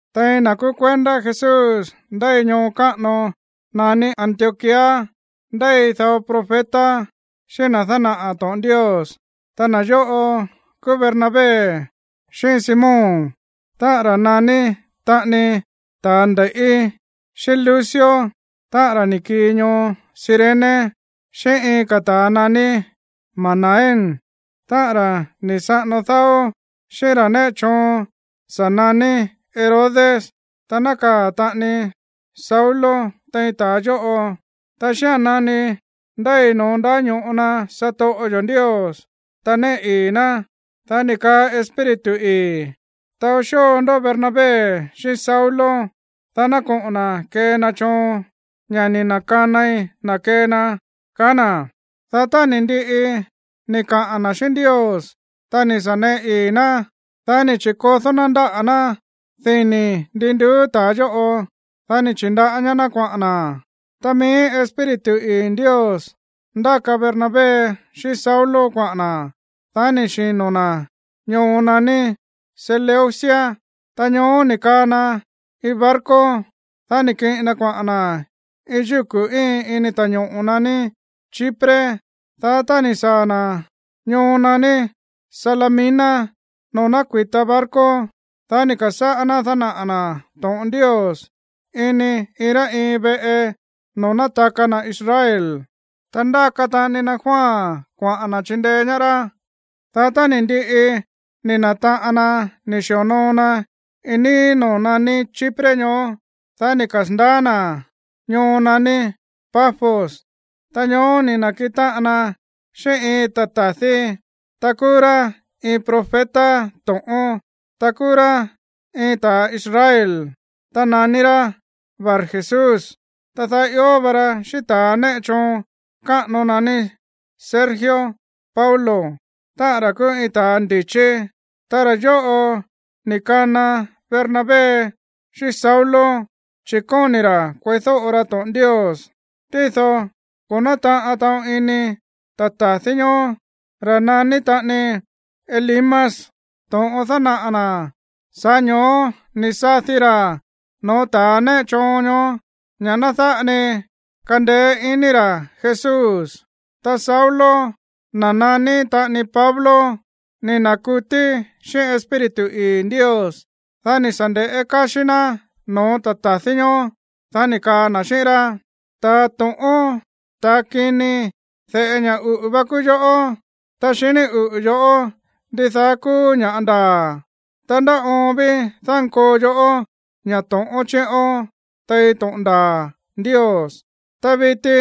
Tein na̱ kúú kuendá Jesús ndéi ñoo káꞌano naní Antioquía ndéi dao profeta xíꞌín na̱ dánaꞌa̱ to̱ꞌon Ndios. Ta na̱ yóꞌo kúú Bernabé, xíꞌín Simón, táꞌa̱n ra̱ naní taꞌani ta̱a nde̱i̱ꞌí, xíꞌín Lucio, táꞌa̱n ra̱ ni̱ kii ñoo Cirene, xíꞌín iin ka̱ ta̱a naní Manaén, táꞌa̱n ra̱ ni̱ saꞌano dáó xíꞌín ra̱ néꞌe choon sa̱ naní Herodes, ta nákaa̱ taꞌani Saulo tein ta̱a yóꞌo. Ta xía̱n nani ndéi no̱ón ndáño̱ꞌo na satoꞌo yo̱ Ndios, ta néꞌe ii̱ ná, dá ni̱ kaa Espíritu ii̱: ―Taó xóo ndó Bernabé xíꞌín Saulo, dá ná koꞌo̱n na̱ kee na choon, ña̱ ni̱ na̱kanai na̱ kee na ―kaá na̱. Dá tá ni̱ ndiꞌi ni̱ kaꞌa̱n na̱ xíꞌín Ndios, ta ni̱ sa̱ neꞌe ii̱ ná, dá ni̱ chi̱kodó ná ndáꞌa̱ ná dini̱ ndi nduú ta̱a yóꞌo. Dá ni̱ chi̱ndaꞌá ñaá ná kuaꞌa̱n na̱. Ta mií Espíritu ii̱ Ndios ndáka Bernabé xíꞌín Saulo kuaꞌa̱n na̱. Dá ni̱ xino̱ na̱ ñoo naní Seleucia. Ta ñoó ni̱ kaa na iin barco, dá ni̱ kiꞌin na kuaꞌa̱n na̱ iin yúku̱ íin ini ta̱ñoꞌo̱ naní Chipre. Dá tá ni̱ saa̱ na̱ ñoo naní Salamina noo̱ nákui̱ta barco, dá ni̱ ka̱sáꞌá ná dánaꞌa̱ na̱ to̱ꞌon Ndios ini iin rá iin veꞌe noo̱ nátaka na̱ Israel. Ta ndáka taꞌani na Juan kuaꞌa̱n na̱ chindeé ñaá rá. Dá tá ni̱ ndiꞌi ni̱ na̱taꞌan na̱ ni̱ xi̱onoo na iin níí noo̱ naní Chipre ñoó, dá ni̱ kasa̱ndaá na̱ ñoo naní Pafos. Ta ñoó ni̱ na̱kiꞌin táꞌan na xíꞌín iin ta̱ ta̱dí, ta kúú rá iin profeta to̱ꞌón, ta kúú rá iin ta̱ Israel, ta naní rá Barjesús. Ta daá ió va ra xíꞌín ta̱a néꞌe choon káꞌano naní Sergio Paulo, táꞌa̱n ra̱ kúú iin ta̱ ndi̱chí. Ta ra̱ yóꞌo ni̱ kana Bernabé xíꞌín Saulo, chi̱ kóni̱ ra̱ kueídóꞌo ra to̱ꞌon Ndios. Tído ko̱ nátaꞌan taꞌon ini ta̱ ta̱dí ñoó, ra̱ naní taꞌani Elimas, to̱ꞌon dánaꞌa̱ na̱. Sa̱ꞌá ño̱ó ni̱ sadi ra̱ no̱ó ta̱ néꞌe choon ñoó ña̱ ná dáꞌa ni kandeé iní ra̱ Jesús. Ta Saulo, na̱ naní taꞌani Pablo, ni̱ na̱kutí xíꞌín Espíritu ii̱ Ndios. Dá ni̱ sa̱ nde̱ꞌé káxí ná no̱ó ta̱ ta̱dí ñoó, dá ni̱ kaa na̱ xíꞌín rá: ―¡Ta̱a to̱ꞌón, ta̱ kini, de̱ꞌe ña̱ uꞌu̱ va kúú yoꞌó, ta xiní uꞌu̱ yo̱ꞌó ndidaá kúú ña̱ ndaa̱! ¿Ndá oon ví dánkoo yoꞌó ña̱ to̱ꞌón chiꞌón tein to̱ꞌon ndaa̱ Ndios? Ta viti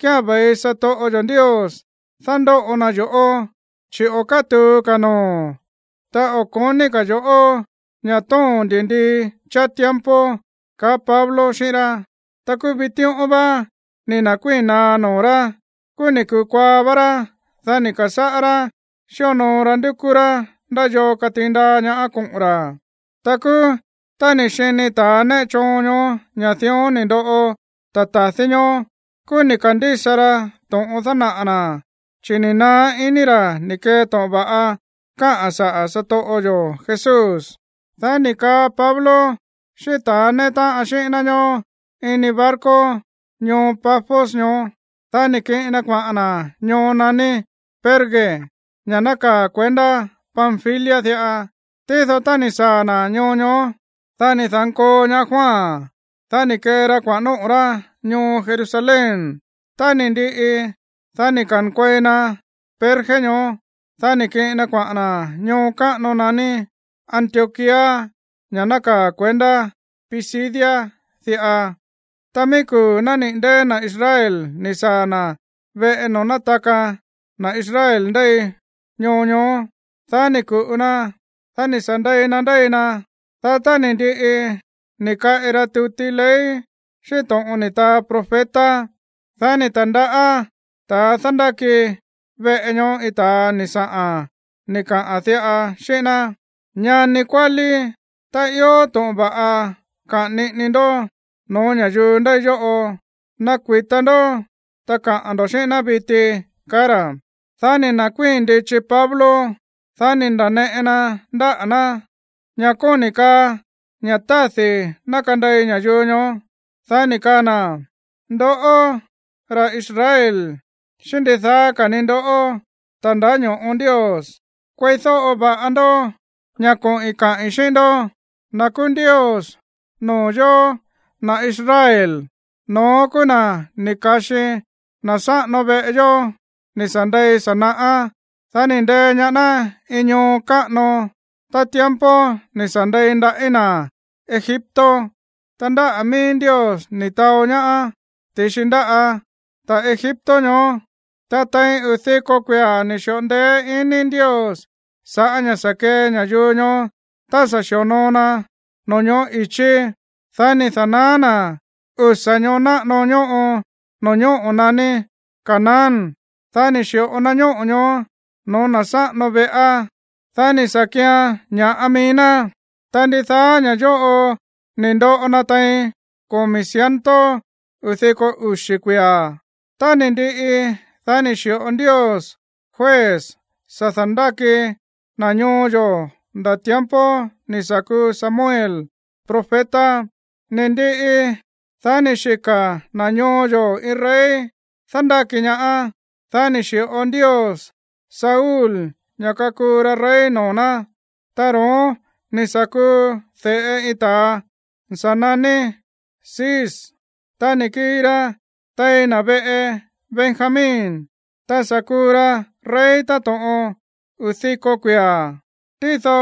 kía̱n ve̱i satoꞌo yo̱ Ndios dándóꞌo na yo̱ꞌó, chi̱ o̱ kátu̱u ka̱ noo̱o̱n, ta o̱ ko̱ní ka̱ yo̱ꞌó ña̱ tóo̱n ndi̱ndii cháá tiempo ―kaá Pablo xíꞌín rá. Ta kúú vitíꞌón vá ni̱ na̱kuíi̱n naá noo̱ rá. Kúú ni̱ kukuaa vá rá. Dá ni̱ ka̱sáꞌá rá xíonoo ra ndúkú rá ndá yoo katiin ndaa ñaá koꞌo̱n ra̱. Ta kúú, tá ni̱ xini ta̱a néꞌe choon ñoó ña̱ dión ni̱ ndoꞌo ta̱ ta̱dí ñoó, kúú ni̱ ka̱ndísa ra to̱ꞌon dánaꞌa̱ na̱, chi̱ ni̱ naá iní ra̱ ni̱ kee to̱ꞌon va̱ꞌa káꞌa̱n saꞌa̱ satoꞌo yo̱ Jesús. Dá ni̱ kaa Pablo xíꞌín ta̱a néꞌe táꞌan xíꞌín ná ñoó ini iin barco ñoo Pafos ñoó, dá ni̱ kiꞌin na kuaꞌa̱n na̱ ñoo naní Perge, ña̱ nákaa̱ kuendá Panfilia diꞌa. Tído tá ni̱ saa̱ na̱ ñoo ñoó, dá ni̱ da̱nkoo ñaá Juan. Dá ni̱ kee ra kuaꞌa̱n nóꞌo̱ rá ñoo Jerusalén. Tá ni̱ ndiꞌi, dá ni̱ ka̱nkuei na Perge ñoó. Dá ni̱ kiꞌin na kuaꞌa̱n na̱ ñoo káꞌano naní Antioquía, ña̱ nákaa̱ kuendá Pisidia diꞌa. Ta mií kuu̱ nániꞌi̱ ndée̱ na̱ Israel ni̱ saa̱ na̱ veꞌe noo̱ nátaka na̱ Israel ndéi ñoo ñoó. Dá ni̱ ku̱ꞌu na, dá ni̱ sa̱ ndei na ndéi na. Dá tá ni̱ ndiꞌi ni̱ kaꞌi ra tuti ley xíꞌín to̱ꞌon ni̱ taa profeta, dá ni̱ ta̱ndaꞌá ta̱a dándáki veꞌe ñoó iin ta̱a ni̱ saꞌa̱n ni̱ kaꞌa̱n diꞌa xíꞌín ná: ―Ñani kuálí, tá ió to̱ꞌon va̱ꞌa kaꞌa̱n niꞌini ndó no̱ó ña̱yuu ndéi yóꞌo, ná kuita ndó ta kaꞌa̱n ndo̱ xíꞌín ná viti ―kaá ra̱. Dá ni̱ nda̱kuíi̱n ndichi Pablo. Dá ni̱ nda̱neꞌe na ndáꞌa̱ ná, ña̱ kóni̱ kaa ña̱ tádi̱ ná kandei ña̱yuu ñoó. Dá ni̱ kaa na̱: ―Ndoꞌó, ra̱ Israel, xíꞌín ndidaá ka̱ ni ndoꞌó, ta̱ ndáño̱ꞌo Ndios, kueídóꞌo va̱ꞌa ndó ña̱ koꞌi̱n kaꞌi̱n xíꞌín ndó. Na̱ kúú Ndios noo̱ yóó, na̱ Israel, no̱ón kúú na̱ ni̱ ka̱xi na̱ sáꞌano veꞌe yó ni̱ sa̱ ndei sa̱ naꞌá. Dá ni̱ ndee ñaá ná iin ñoo káꞌano tá tiempo ni̱ sa̱ ndei ndaꞌí na̱ Egipto. Ta ndáꞌa̱ mií Ndios ni̱ taó ñaá ti̱xi ndáꞌa̱ ta̱ Egipto ñoó. Ta tein uu̱ diko kuia̱ ni̱ xi̱ꞌo ndeé iní Ndios sa̱ꞌá ña̱ sa̱ kee ña̱yuu ñoó tá sa̱ xi̱onoo na no̱ñoꞌó i̱chí. Dá ni̱ da̱naá na̱ usa̱ ñoo náꞌano ñóꞌo no̱ñóꞌo̱ naní Canaán. Dá ni̱ xi̱ꞌo na ñóꞌo̱ ñoó no̱ó na̱ sáꞌano veꞌá, dá ni̱ sa̱ kian ña̱ꞌa mií ná. Ta ndidaá ña̱ yóꞌo ni̱ ndoꞌo na tein komi̱ ciento uu̱ diko uxi̱ kuia̱. Tá ni̱ ndiꞌi, dá ni̱ xi̱ꞌo Ndios juez sa̱ da̱ndáki na̱ ñoo yo̱ nda̱ tiempo ni̱ sa̱ kuu Samuel profeta. Ni̱ ndiꞌi, dá ni̱ xika̱ na̱ ñoo yo̱ iin rey dándáki ñaá. Dá ni̱ xi̱ꞌo Ndios Saúl ña̱ kakuu ra rey noo̱ ná. Ta ro̱ón ni̱ sa̱ kuu de̱ꞌe iin ta̱a ni̱ sa̱ naní Cis. Ta ni̱ kii ra tein na̱ veꞌe Benjamín. Ta sa̱ kuu ra rey táto̱ꞌon uu̱ diko kuia̱. Tído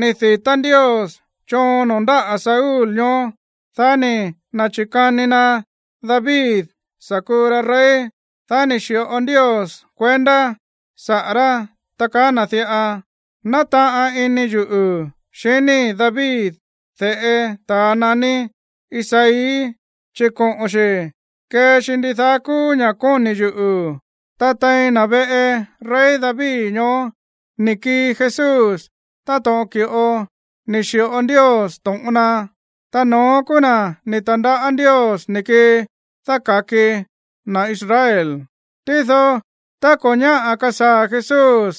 ni̱ di̱tá Ndios choon noo̱ ndáꞌa̱ Saúl ñoó, dá ni̱ na̱chi̱kani na David sa̱ kuu ra rey. Dá ni̱ xi̱ꞌo Ndios kuendá saꞌa̱ rá, ta kaá na̱ diꞌa: “Nátaꞌan ini yuꞌu̱ xiníi̱ David, de̱ꞌe ta̱ naní Isaí, chi̱ koꞌo̱n xi̱ kee xi ndidaá kúú ña̱ kóni̱ yuꞌu̱.” ’Ta tein na̱ veꞌe rey David ñoó ni̱ kii Jesús táto̱ꞌon ki̱ꞌo ni̱ xi̱ꞌo Ndios to̱ꞌon na. Ta no̱ón kúú na̱ ni̱ ta̱ndaꞌá Ndios ni̱ kii dáka̱ki na̱ Israel. Tído tá ko̱ ñáꞌa̱ kasaa̱ Jesús,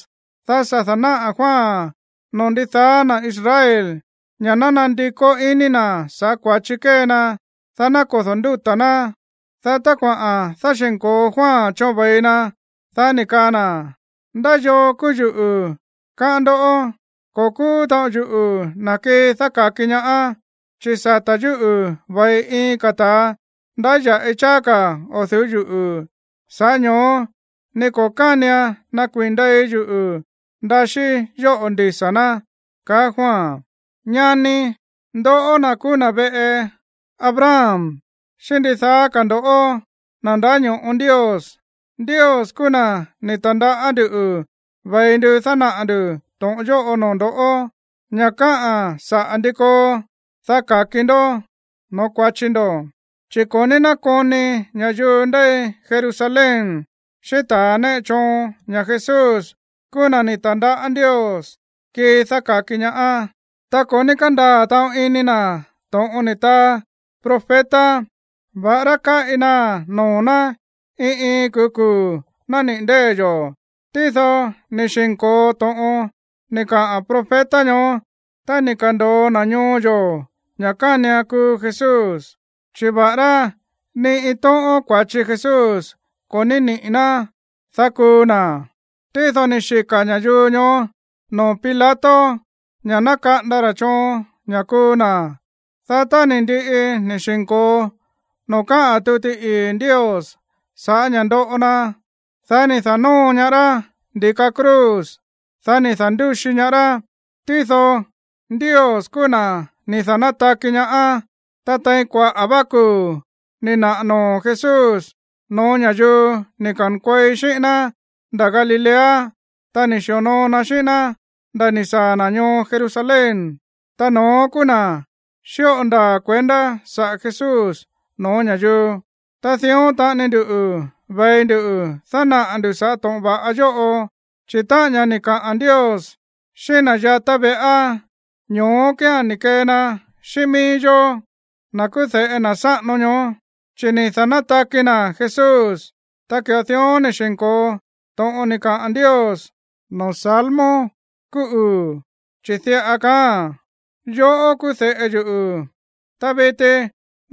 dá sa̱ da̱náꞌa̱ Juan noo̱ ndidaá na̱ Israel ña̱ ná nandikó iní na̱ sa̱ꞌá kua̱chi kée na, dá ná kodo̱ ndúta̱ ná. Dá tá kuaꞌa̱n dáxi̱nko̱o Juan choon ve̱i na, dá ni̱ kaa na̱: “¿Ndá yoo kúú yuꞌu̱, káꞌán ndó? Ko̱ kúú taꞌon yuꞌu̱ na̱ kii dáka̱ki ñaá, chi̱ sata̱ yúꞌu̱ ve̱i iin ka̱ ta̱a ndáya̱ꞌi cháá ka̱ o̱ du̱ú yuꞌu̱, sa̱ꞌá ño̱ó ni ko̱ kánian nakuii̱n ndei yuꞌu̱ ndaxíí yóꞌo̱ ndisa̱ ná”, kaá Juan. ’Ñani, ndoꞌó na̱ kúú na̱ veꞌe Abraham, xíꞌín ndidaá ka̱ ndo̱ꞌó, na̱ ndáño̱ꞌo Ndios. Ndios kúú na̱ ni̱ ta̱ndaꞌá nduꞌu̱ ve̱i ndu dánaꞌa̱ ndu̱ to̱ꞌon yóꞌo noo̱ ndo̱, ña̱ káꞌa̱n saꞌa̱ ndi koo, dá ka̱ki ndó no̱ó kua̱chi ndo̱. Chi̱ ko̱ ní nákoni ña̱yuu ndéi Jerusalén, xíꞌín ta̱a néꞌe choon ña̱ Jesús kúú na̱ ni̱ ta̱ndaꞌá Ndios kii dáka̱ki ñaá. Ta ko̱ ní kándaa̱ taꞌon ini na̱ to̱ꞌon ni̱ taa profeta, va̱ꞌará káꞌi naa̱n noo̱ ná iin iin kuu̱ kuu̱ nániꞌi̱ ndée̱ yo̱. Tído ni̱ xi̱nko̱o to̱ꞌon ni̱ kaꞌa̱n profeta ñoó tá ni̱ ka̱ndo̱o na̱ ñoo yo̱ ña̱ kánian kuu Jesús. Chi̱ va̱ꞌará ni iin tóꞌón kua̱chi Jesús ko̱ ní niꞌi̱ ná, dá kuu na̱, tído ni̱ xika̱ ña̱yuu ñoó noo̱ Pilato ña̱ ná kaꞌanda ra̱ choon ña̱ kuu na̱. Dá tá ni̱ ndiꞌi ni̱ xi̱nko̱o noo̱ káꞌa̱n tuti ii̱ Ndios sa̱ꞌá ña̱ ndoꞌo na, dá ni̱ da̱nóo ñaá rá ndi̱ka cruz. Dá ni̱ da̱ndúxi ñaá rá. Tído Ndios kúú na̱ ni̱ da̱nátaki ñaá. Ta tein kuaꞌa̱ vá kuu̱ ni̱ naꞌa̱ noo̱ Jesús no̱ó ña̱yuu ni̱ ka̱nkuei xíꞌín ná nda̱ Galilea, ta ni̱ sa̱ xi̱onoo na xíꞌín ná nda̱ ni̱ saa̱ na̱ ñoo Jerusalén. Ta no̱ón kúú na̱ xíꞌo ndaa̱ kuendá saꞌa̱ Jesús no̱ó ña̱yuu. ’Ta dión taꞌani nduꞌu̱ ve̱i ndu dánaꞌa̱ ndu̱ sa̱ꞌá to̱ꞌon va̱ꞌa yóꞌo, chi̱ táꞌa̱n ña̱ ni̱ kaꞌa̱n Ndios xíꞌín na̱ yatá veꞌá, ñoó kía̱n ni̱ kee na xíꞌín mií yó, na̱ kúú de̱ꞌe na̱ sáꞌano ñoó, chi̱ ni̱ da̱nátaki na̱ Jesús. Ta ki̱ꞌo dión ni̱ xi̱nko̱o to̱ꞌon ni̱ kaa Ndios noo̱ salmo kúú uu̱, chi̱ diꞌa kaáa̱n: “Yoꞌó kúú de̱ꞌe yuꞌu̱, ta viti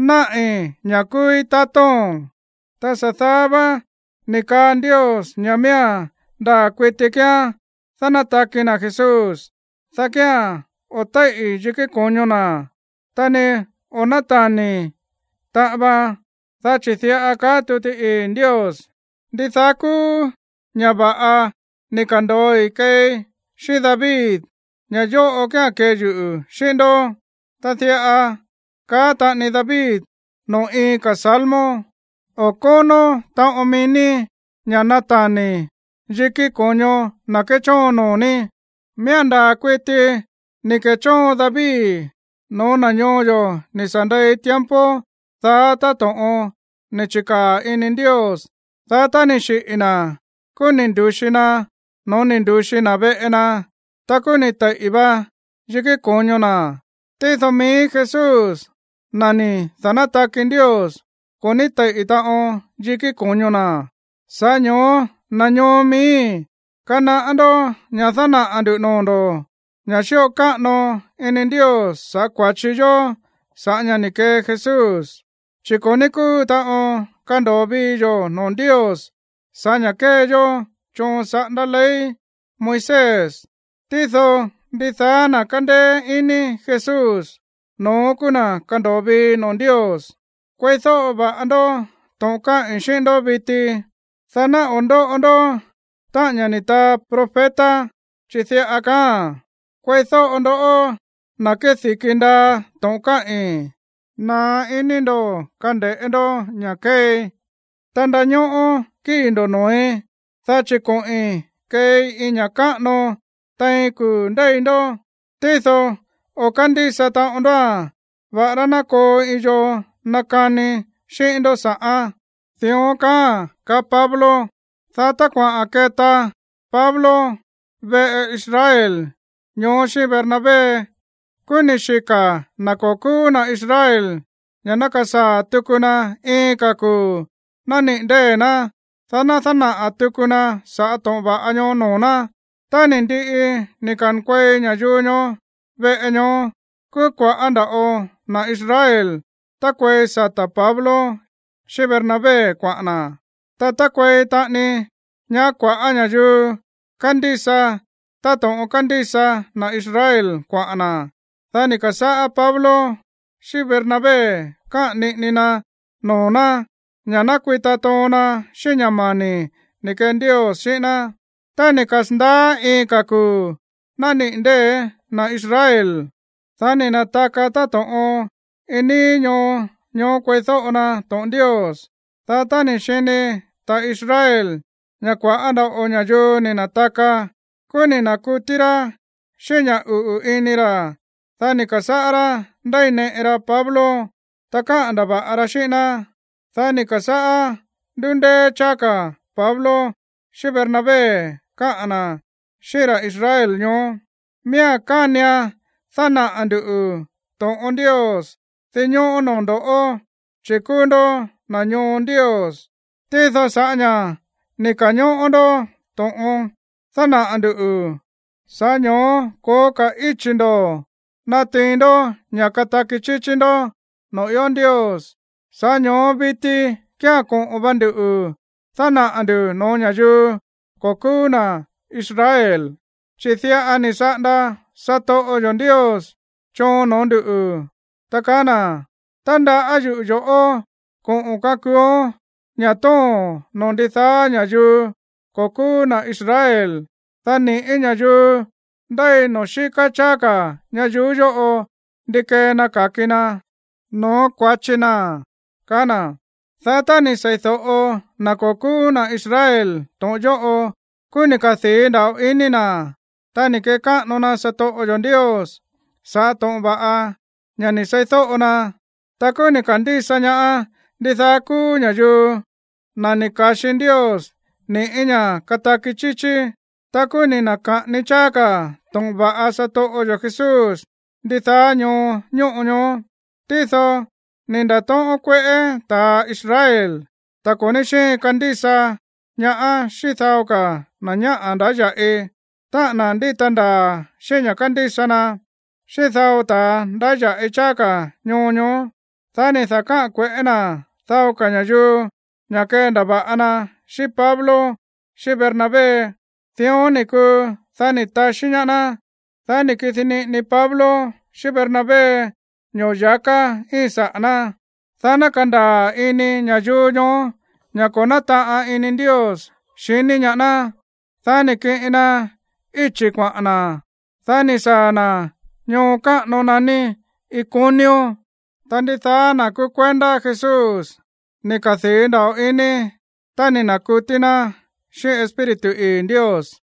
náꞌi̱ ña̱ kúúí tatóo̱n.” ’Ta sa̱ daá vá ni̱ kaa Ndios ña̱ miía̱n ndaa̱ kuiti kíán dánátaki na̱ Jesús, dá kía̱n o̱ téíꞌi̱ yikí ko̱ño na̱, ta ni o̱ nátani̱ taꞌan vaan. Dá chi̱ diꞌa kaá tuti ii̱ Ndios: “Ndidaá kúú ña̱ va̱ꞌa ni̱ ka̱ndo̱oi keei xíꞌín David, ña̱ yóꞌo kía̱n kee yuꞌu̱ xíꞌín ndó.” Ta diꞌa káꞌa̱n taꞌani David noo̱ iin ka̱ salmo: “O̱ kónó taꞌon mií ní ña̱ natani̱ yiki ko̱ño na̱ kéchóon noo̱ ní.” ’Miía̱n ndaa̱ kuiti ni̱ ke̱chóon David no̱ó na̱ ñoo yo̱ ni̱ sa̱ ndei tiempo daá táto̱ꞌon ni̱ chi̱kaa̱ ini Ndios. Dá tá ni̱ xiꞌi̱ na̱, kúú ni̱ ndu̱xi na no̱ó ni̱ ndu̱xi na̱ veꞌe na. Ta kúú ni̱ teiꞌi̱ va yikí ko̱ño na̱. Tído mií Jesús, na̱ ni̱ da̱nátaki Ndios, ko̱ ní teiꞌi̱ taꞌon yikí ko̱ño na̱. ’Sa̱ꞌá ño̱ó, na̱ ñoo miíi̱, kanaꞌá ndó ña̱ dánaꞌa̱ nduꞌu̱ noo̱ ndo̱ ña̱ xíꞌo káꞌano ini Ndios sa̱ꞌá kua̱chi yo̱ sa̱ꞌá ña̱ ni̱ kee Jesús. Chi̱ ko̱ ní kúu taꞌon kando̱o vii yo̱ noo̱ Ndios sa̱ꞌá ña̱ kée yó choon saꞌándá ley Moisés. Tído, ndidaá na̱ kándéé iní Jesús, no̱ón kúú na̱ kándo̱o vii noo̱ Ndios. Kueídóꞌo va̱ꞌa ndó to̱ꞌon káꞌi̱n xíꞌín ndó viti, dá ná o̱ ndóꞌo ndó táꞌa̱n ña̱ ni̱ taa profeta, chi̱ diꞌa kaáa̱n: Kueídóꞌo ndoꞌó, na̱ kédi̱ki ndaa to̱ꞌon káꞌi̱n. Naá iní ndo̱ kande̱ꞌé ndó ña̱ kéei, ta ndañóꞌó kíi̱ ndo̱ noo̱í. Dá chi̱ koꞌi̱n keei iin ña̱ káꞌano tein kuu̱ ndéi ndó. Tído o̱ kándísa taꞌon ndóa̱n, va̱ꞌará ná koo iin yoo nakani xíꞌín ndó sa̱ꞌán. Dión kaáa̱n ―kaá Pablo. Dá tá kuaꞌa̱n keta Pablo veꞌe Israel ñoó xíꞌín Bernabé, kúú ni̱ xika̱ na̱ ko̱ kúú na̱ Israel ña̱ ná kasaa̱ tuku na iin ka̱ kuu̱ nániꞌi̱ ndée̱ ná, dá ná dánaꞌa̱ tuku na sa̱ꞌá to̱ꞌon va̱ꞌa ñoó noo̱ ná. Tá ni̱ ndiꞌi ni̱ ka̱nkuei ña̱yuu ñoó veꞌe ñoó, kúú kua̱ꞌá nda̱ꞌo na̱ Israel tákuei sata̱ Pablo xíꞌín Bernabé kuaꞌa̱n na̱. Ta tákuei taꞌani ñaá kua̱ꞌá ña̱yuu kándísa táto̱ꞌon kándísa na̱ Israel kuaꞌa̱n na̱. Dá ni̱ ka̱sáꞌá Pablo xíꞌín Bernabé káꞌa̱n niꞌini na noo̱ ná ña̱ ná kuita toon na xíꞌín ña̱ mani̱ ni̱ kee Ndios xíꞌín ná. Tá ni̱ kasa̱ndaá iin ka̱ kuu̱ nániꞌi̱ ndée̱ na̱ Israel, dá ni̱ na̱taka táto̱ꞌon iin níí ñoo ñoó kueídóꞌo na to̱ꞌon Ndios. Dá tá ni̱ xini ta̱ Israel ña̱ kua̱ꞌá nda̱ꞌo ña̱yuu ni̱ na̱taka, kúú ni̱ na̱kutí rá xíꞌín ña̱ uꞌu̱ ini ra̱. Dá ni̱ ka̱sáꞌá rá ndéineꞌe ra Pablo, ta káꞌa̱n ndava̱ꞌa ra xíꞌín ná. Dá ni̱ ka̱sáꞌá ndúndéé cháá ka̱ Pablo xíꞌín Bernabé káꞌa̱n na̱ xíꞌín ra̱ Israel ñoó: ―Miía̱n kánian dánaꞌa̱ nduꞌu̱ to̱ꞌon Ndios dinñóꞌó noo̱ ndo̱ꞌó, chi̱ kúú ndó na̱ ñoo Ndios. Tído sa̱ꞌá ña̱ ni̱ ka̱ñóꞌó ndó to̱ꞌon dánaꞌa̱ ndu̱, sa̱ꞌá ño̱ó ko̱ó ka̱ íchi̱ ndo̱ natiin ndó ña̱ kataki chíchí ndó noo̱ ió Ndios. Sa̱ꞌá ño̱ó viti kía̱n koꞌo̱n va nduꞌu̱ dánaꞌa̱ ndu̱ no̱ó ña̱yuu ko̱ kúú na̱ Israel. Chi̱ diꞌa ni̱ saꞌanda satoꞌo yo̱ Ndios choon noo̱ ndúꞌu̱, ta kaá na̱: Tandaꞌá yuꞌu̱ yo̱ꞌó koꞌo̱n kakuuón ña̱ tóo̱n noo̱ ndidaá ña̱yuu ko̱ kúú na̱ Israel, dá ni̱ꞌí ña̱yuu ndéi noo̱ xíká cháá ka̱ ñayuú yóꞌo ndi kee na ka̱ki na no̱ó kua̱chi na̱. Dá tá ni̱ sei̱do̱ꞌo na̱ ko̱ kúú na̱ Israel to̱ꞌon yóꞌo, kúú ni̱ kadii̱ nda̱ꞌo ini na̱. Ta ni̱ kekáꞌano na satoꞌo yo̱ Ndios sa̱ꞌá to̱ꞌon va̱ꞌa ña̱ ni̱ seídóꞌo na. Ta kúú ni̱ ka̱ndísa ñaá ndidaá kúú ña̱yuu, na̱ ni̱ ka̱xi Ndios ni̱ꞌí ña̱ kataki chíchí. Ta kúú ni̱ na̱ka̱ꞌani cháá ka̱ to̱ꞌon va̱ꞌa satoꞌo yo̱ Jesús ndidaá ñoo ñóꞌo ñoó. Tído ni̱ nda̱tóꞌón kueꞌé ta̱ Israel, ta̱ ko̱ ní xíin kandísa ñaá xíꞌín dao na̱ ñáꞌa̱ ndáya̱ꞌi, táꞌa̱n na̱ ndíta ndaa̱ xíꞌín ña̱ kándísa na, xíꞌín dao ta̱a ndáya̱ꞌi cháá ka̱ ñoo ñoó. Dá ni̱ da̱káꞌa̱n kue̱ꞌé na̱ dao ka̱ ña̱yuu ña̱ kendava̱ꞌa na xíꞌín Pablo xíꞌín Bernabé. Dión ni̱ kuu, dá ni̱ taxí ñaá ná. Dá ni̱ kidi niꞌini Pablo xíꞌín Bernabé ño̱ya̱ká íin saꞌa̱ ná, dá ná kandaa̱ ini ña̱yuu ñoó ña̱ ko̱ nátaꞌan ini Ndios xiní ñaá ná. Dá ni̱ kiꞌin na íchi̱ kuaꞌa̱n na̱, dá ni̱ saa̱ na̱ ñoo káꞌano naní Iconio. Ta ndidaá na̱ kúú kuendá Jesús ni̱ kadii̱ nda̱ꞌo ini, ta ni̱ na̱kutí ná xíꞌín Espíritu ii̱ Ndios.